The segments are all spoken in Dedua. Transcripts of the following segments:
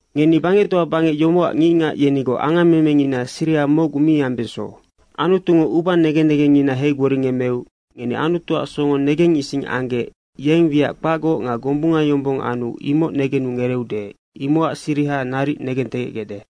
Ngeni bangectoa bangec yomocac ngicngac yenigoc angamemengina siriha mocgu mi ambeso. Anutungo uba negen negengngina heigboringemmeu ngeni Anutuac songo negengising anggec yeng wiac kpacgoc nga gombunga yombong anu imoc negenu ngereeude, imocac siriha naric negentegecgecde.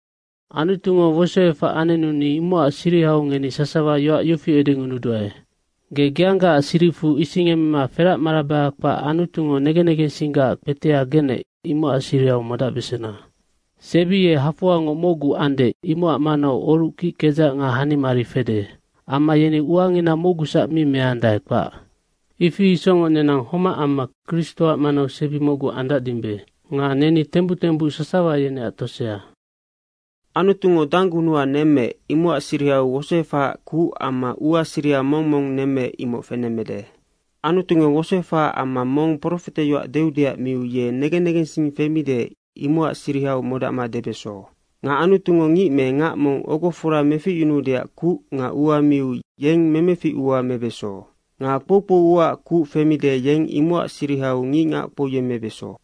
Anutungo wosoefac anenu ni imocac sirihau ngeni sasawa yoac yofi edengunuduae. Ge geanggaac siricfu isingemema feracmarabaha kpac Anutungo negen negensinggac kpetea genec, imocac sirihau modacbesena. Sebi ye hafoangoc mocgu ande, imocac manau oruc kickedzac nga hanimarinina fede. Amma yeni uangina mocgusac mi meandae, kpac. Ifi isocngoc nenang homac amma Kristoac manau sebi mocgu andacdimbe nga neni tembuc tembuc sasawa yeneac tosea. Anutungo danggunuha nemmeec, imocac sirihau wosoefahaac kuc amma ua siriha mong mong nemmeec, imoc fenemmede. Anutungo wosoefahaac amma mong profeteyoac deudeac miu, ye negen negensing femide, imocac sirihau modacma debeso. Nga Anutungo ngic me ngac mong ogofora meficyunuudeac kuc nga ua miu yeng memefic uanoc mebeso. Nga kpoukpou uaac kuc femide, yeng imocac sirihau ngicngac kpouyemmebeso.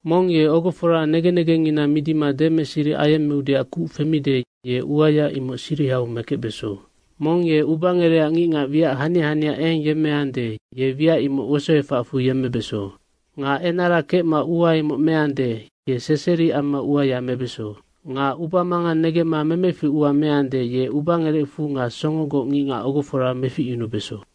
Mong ye ogofora negen negengngina midima demeseri ayemmeudeac kuc femide, ye uaya imocac sirihau mekecbeso. Mong ye ubangerecac ngicngac wiac hania hania eng yemmeande, ye wiac imoc wosoefacfu yemmebeso. Nga enara kecma ua imoc meande, ye seseri amma uaya mebeso. Nga ubamangang negemma memeficua meande, ye ubangerecfu nga songogoc ngicngac ogofora meficyunubeso.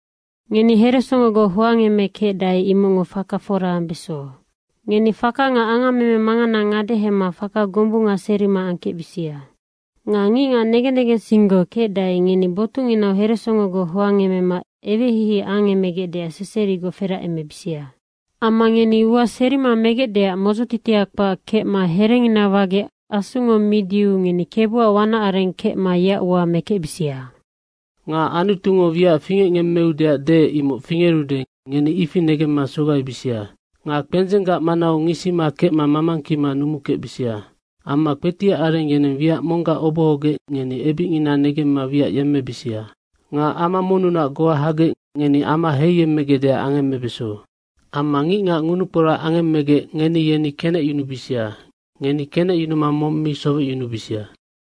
Ngeni heresongogoc hoangemekecdae, imocngo faka fora ambeso. Ngeni faka nga angammeme mangana ngadehema faka gombunga serima angkecbisia. Nga ngicngac negen negensinggoc kecdae, ngeni botucnginau heresongogoc hoangemema eweheihei angemegecdeac seserigoc feracemebisia. Amma ngeni ua serima megecdeac modzotitia kpac kecma herengina wagec Asungo midiu ngeni Kebuac wanac areng kecma yeac ua mekecbisia. Nga Anutungo wiac fingecngemmeudeac deec, imoc fingerude, ngeni ifi negemma sogaibisia. Nga kpendzenggac manau ngisima kecma mamangkima numukecbisia. Amma kpetiac areng yeneng wiac monggac obohogec ngeni ebicngina negemma wiac yemmebisia. Nga ama monnunac goa hagec ngeni ama heiyemmegecdeac angemmebeso. Amma ngicngac ngunukporac angemmegec ngeni yeni kenecyunubisia! Ngeni kenecyunuma mong mi sowecyunubisia.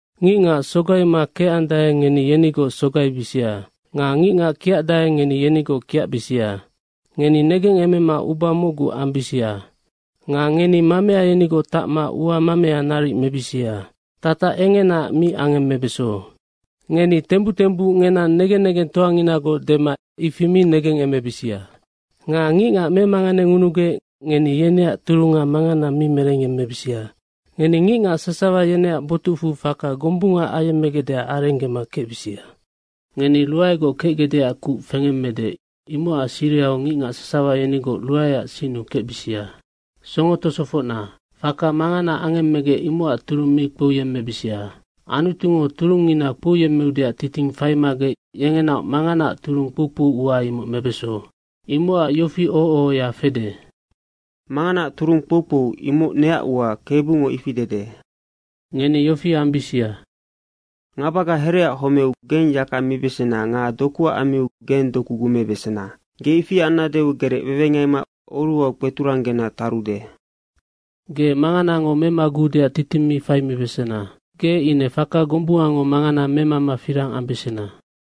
Ngicngac sogaima kecandae, ngeni yenigoc sogaibisia. Nga ngicngac kiacandae, ngeni yenigoc kiacbisia. Ngeni negengemema uba mocgu ambisia. Nga ngeni mamea yenigoc tacma ua mamea naric mebisia, tatac engenaac mi angemmebeso. Ngeni tembuc tembuc ngenang negen negengtoanginagoc dema ifi mi negengemebisia. Nga ngicngac memanganengunugec ngeni yeneac turunga mangana mi merengyemmebisia. Ngeni ngicngac sasawa yeneac botucfu faka gombunga ayemmegecdeac arenggema kecbisia. Ngeni ruaegoc kecgecdeac kuc fengemmede, imocac sirihau ngicngac sasawa yenigoc ruaeac sinnu kecbisia. Songo tosofocna, faka mangana angemmegec, imocac turung mi kpouyemmebisia. Anutungo turungngina kpouyemmeudeac titing faimagec yengenaoc manganaac turung kpoukpou ua imoc mebeso. Imocac yofi oho ohoya fede, “Manganaac turung kpoukpou, imoc neac ua, Kebungo ifi dede.” Ngeni yofi ambisia, “Ngabaga hereaac homeu geng yaka mibesena nga dokuac ammiu geng doku gumebesena. Ge ifi annadeu gerecwewengaima oruhau kpeturanggena tarude.” Ge manganango memaguudeac titing mi faimibesena, ge ine faka gombungango mangana memama firang ambesena.